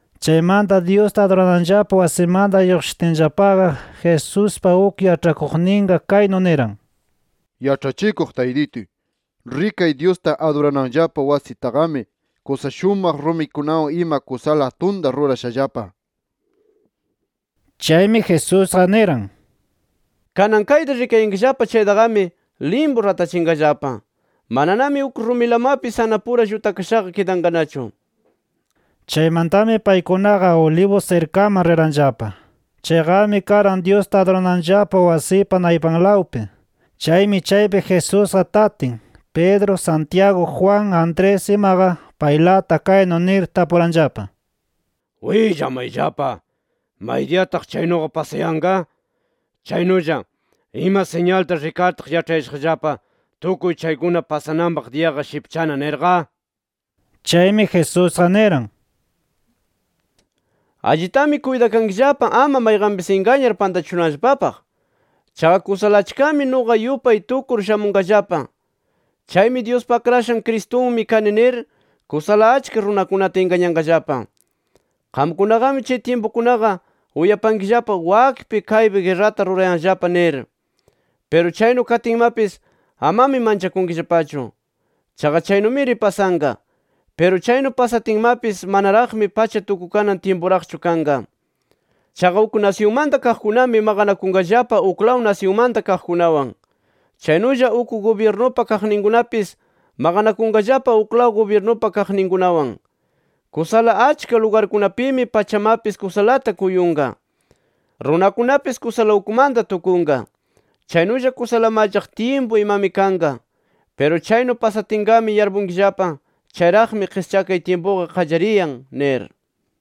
Chaymanta Dyusta adurananllapa wasimanta lluqshitinllapaqa Jesuspa uk yaĉhakuqninqa kaynu niran: —Yaĉhachikuq Taytituy, rikay Dyusta adurananllapa wasitaqami kusa shumaq rumikunawan ima kusala atunta rurashallapa nir. Chaymi Jesusqa niran: —Kanan kayta rikayankillapa chaytaqami limpu ratachinqallapa. Mananami uk rumilamapis anapura llutakashaqa kidanqanachu nir. Chaymantami paykunaqa Olivos sirkaman riranllapa. Chayqami karan Dyusta adurananllapa wasipa naypanlawpi. Chaymi chaypi Jesusqa tatin, Pedro, Santiago, Juan, Andrés imaqa paylata kaynu nir tapuranllapa: —Willamayllapa: ¿Maydiyataq chaynuqa pasayanqa? Chaynulla ¿ima siñalta rikartaq yaĉhayashaqllapa, tukuy chaykuna pasananpaq diyaqa shipchana? nirqa. Chaymi, Jesusqa niran: —Allitami kuytakankillapa, ama mayqanpis ingañar pantachishunanllapapaq. Chaqa kusala achkami nuqa yupay tukur shamunqallapa. Chaymi, ‘Dyuspa Akrashan Cristunmi kani’ nir, kusala achka runakunata ingañanqallapa. “Qamkunaqami chay tyimpukunaqa uyapankillapa wakpi kaypi guerrata rurayanllapa nir. Piru chaynu katinmapis amami manchakunkillapachu. Chaqa chaynumiri pasanqa. Piru chaynu pasatinmapis manaraqmi pacha tukukanan tyimpuraqchu kanqa. Chaqa uk nasyunmanta kaqkunami maqanakunqallapa uklaw nasyunmanta kaqkunawan. Chaynulla uk gubyirnupa kaqninkunapis maqanakunqallapa uklaw gubyirnupa kaqninkunawan. Kusala achka lugarkunapimi pachamapis kusalata kuyunqa, [runakunapis kusala ukmanta tukunqa]. Chaynulla kusala mallaq tyimpu, imami kanqa. Piru chaynu pasatinqami yarpunkillapa, chayraqmi qischakay tyimpuqa qallariyan nir.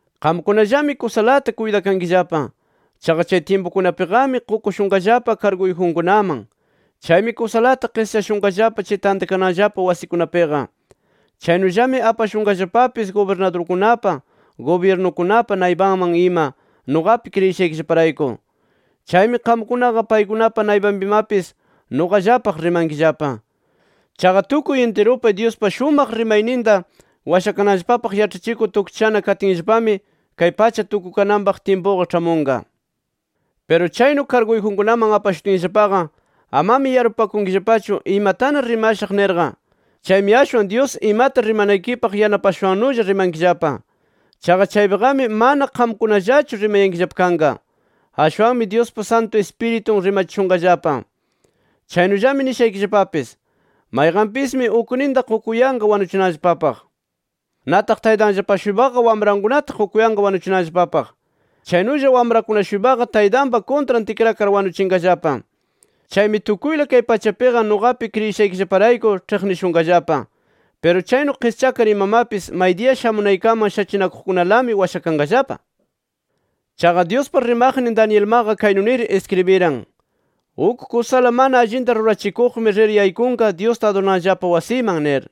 “Qamkunallami kusalata kuytakankillapa. Chaqa chay tyimpukunapiqami qukushunqallapa karguyjunkunaman. Chaymi kusalata qischashunqallapa chay tantakananllapa wasikunapiqa. Chaynullami apashunqallapapis gubirnadurkunapa, gubyirnukunapa naypanman ima nuqapi kriyishaykillaparayku. Chaymi qamkunaqa paykunapa naypanpimapis nuqallapaq rimankillapa. Chaqa tukuy intirupi Dyuspa shumaq rimayninta washakananllapapaq yaĉhachikur tukchishana katinllapami, kay pacha tukukananpaq tyimpuqa ĉhamunqa. Piru chaynu karguyjunkunaman apashutinllapaqa, amami yarpupakunkillapachu imatana rimashaq nirqa. Chaymi ashwan Dyus imata rimanaykipaq yanapashushannulla rimankillapa. Chaqa chaypiqami mana qamkunallachu rimayankillapa kanqa. Ashwanmi Dyuspa Santu Ispiritun rimachishunqallapa. “Chaynullami nishaykillapapis: Mayqanpismi ukninta qukuyanqa wanuchinanllapapaq. Nataq taytanllapa-shuypaqa wamrankunata qukuyanqa wanuchinanllapapaq. Chaynulla wamrakuna-shuypaqa taytanpa kuntran tikrakar wanuchinqallapa. Chaymi tukuyla kay pachapiqa nuqapi kriyishaykillaparayku ĉhiqnishunqallapa. Piru chaynu qischakar imamapis maydiya shamunaykaman shachinakuqkunalami washakanqallapa. “Chaqa Dyuspa rimaqnin Danielmaqa kaynu nir iskribiran: ‘Uk kusala mana allinta rurachikuqmi rir yaykunqa, Dyusta adurananllapa wasiman’ nir.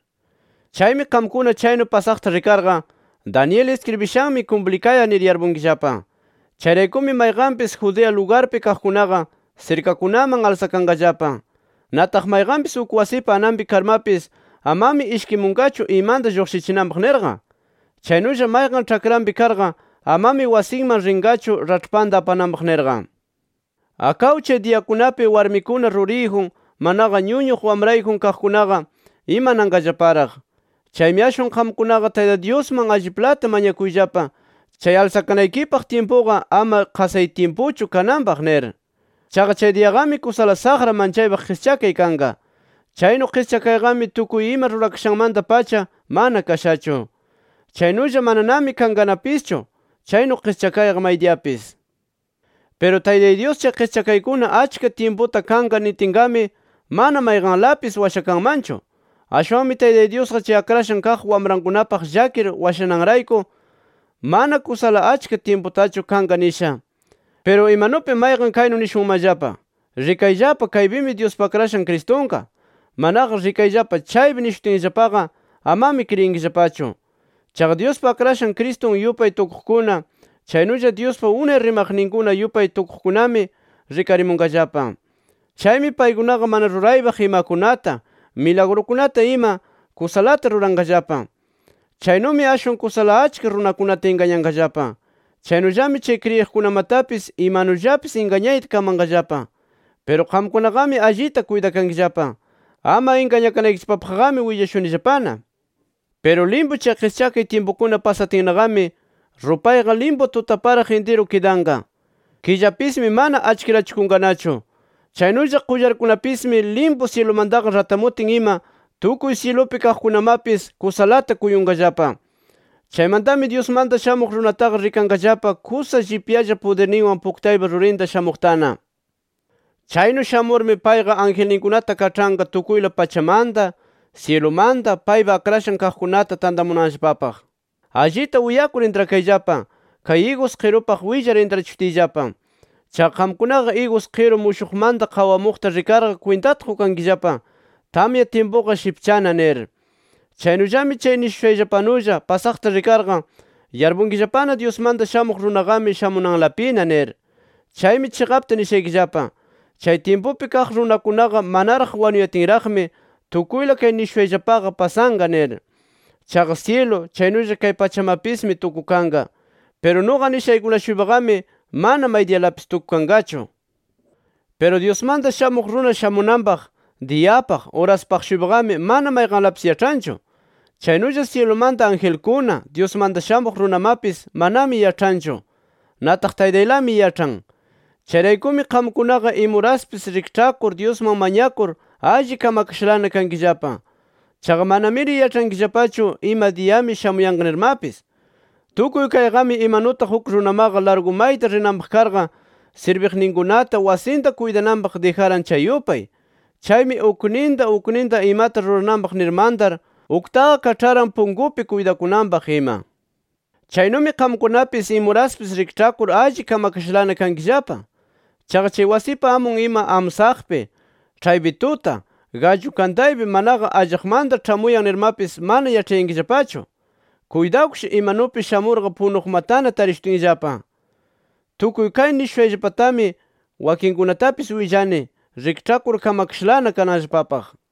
Chaymi qamkuna chaynu pasaqta rikarqa, Daniel iskribishanmi kumplikayan nir yarpunkillapa. Chayraykumi mayqanpis Judea lugarpi kaqkunaqa sirkakunaman alsakanqallapa. Nataq mayqanpis uk wasipa ananpi karmapis amami ishkimunqachu, imanta lluqshichinanpaq nirqa. Chaynulla, mayqan ĉhakranpi karqa amami wasinman rinqachu raĉhpanta apananpaq nirqa. ¡Akaw chay diyakunapi warmikuna ruriyjun, manaqa ñuñuq wamrayjun kaqkunaqa imananqallaparaq! Chaymi ashwan qamkunaqa Taytay Dyusman alliplata mañakuyllapa, chay alsakanaykipaq tyimpuqa ama chay qasay tyimpuchu kananpaq nir. Chaqa, chay diyaqami kusala saqra manchaypaq qischakay kanqa. Chaynu qischakayqami tukuy ima rurakashanmanta-pacha mana kashachu. Chaynulla mananami kanqanapischu chaynu qischakayqa maydiyapis. Piru Taytay Dyus chay qischakaykuna achka tyimputa kanqa nitinqami, mana mayqanlapis washakanmanchu. Ashwanmi Taytay Dyusqa chay akrashan kaq wamrankunapaq llakir washananrayku, mana kusala achka tyimputachu kanqa nisha. “Piru imanupi mayqan kaynu nishunmanllapa: ‘Rikayllapa kaypimi Dyuspa Akrashan Cristunqa’, manaqa ‘Rikayllapa chaypi’ nishutinllapaqa, amami kriyinkillapachu. Chaqa Dyuspa Akrashan Cristun yupay tukuqkuna, chaynulla Dyuspa unay rimaqninkuna yupay tukuqkunami rikarimunqallapa. Chaymi paykunaqa mana ruraypaq imakunata, milagrukunata ima, kusalata ruranqallapa. Chaynumi ashwan kusala achka runakunata ingañanqallapa. Chaynullami chay kriyiqkunamatapis imanullapis ingañayta kamanqallapa. ¡Piru qamkunaqami allita kuytakankillapa! Ama ingañakanaykillapapaqqami willashunillapana. “Piru limpu chay qischakay tyimpukuna pasatinnaqami, rupayqa limpu tutaparaq intiru kidanqa. Killapismi mana achkirachikunqanachu. Chaynulla qullarkunapismi limpu syilumantaqa ratamutin ima, tukuy syilupi kaqkunamapis kusalata kuyunqallapa. Chaymantami Dyusmanta Shamuq Runataqa rikanqallapa kusa llipyalla pudirninwan puktaypa rurinta shamuqtana. Chaynu shamurmi payqa angelninkunata kaĉhanqa tukuyla pachamanta, syilumanta, paypa akrashan kaqkunata tantamunanllapapaq. “Allita uyakur intrakayllapa kay igus qirupaq willar intrachishutiyllapa. Chaqa qamkunaqa igus qiru mushuqmanta qawamuqta rikarqa kwintata qukankillapa, tamya tyimpuqa shipchana nir. Chaynullami chay nishushayllapanulla pasaqta rikarqa yarpunkillapana Dyusmanta Shamuq Runaqami shamunanlapina nir. Chaymi chiqapta nishaykillapa: Chay tyimpupi kaq runakunaqa manaraq wanuyatinraqmi tukuyla kay nishushayllapaqa pasanqa nir. Chaqa syilu chaynulla kay pachamapismi tukukanqa. Piru nuqa nishaykuna-shuypaqami mana maydiyalapis tukukanqachu. “Piru Dyusmanta Shamuq Runa shamunanpaq diyapaq, uraspaq-shuypaqami, mana mayqanlapis yaĉhanchu. Chaynulla syilumanta angelkuna, Dyusmanta Shamuq Runamapis manami yaĉhanchu. Nataq Taytaylami yaĉhan. Chayraykumi qamkunaqa imuraspis rikĉhakur [Dyusman mañakur] alli kamakashalana kankillapa. Chaqa manamiri yaĉhankillapachu ima diyami shamuyanqa nirmapis. “Tukuy kayqami imanutaq uk runamaqa largu mayta rinanpaq karqa, sirbiqninkunata wasinta kuytananpaq dijaran chay yupay. Chaymi ukninta ukninta imata rurananpaq nir mantar, uktaqa kaĉharan punkupi kuytakunanpaq ima. Chaynumi qamkunapis imuraspis rikĉhakur allita kamakashalana kankillapa. Chaqa chay wasipa amun ima amsaqpi, ĉhaypi tuta, gallu kantaypi manaqa allaqmanta ĉhamuyan nirmapis mana yaĉhayankillapachu. Kuytawkish, imanupi shamurqa punuqmatana tarishutinllapa. Tukuy kay nishushayllapallatami wakinkunatapis willani, rikĉhakur kamakashalana kananllapapaq”.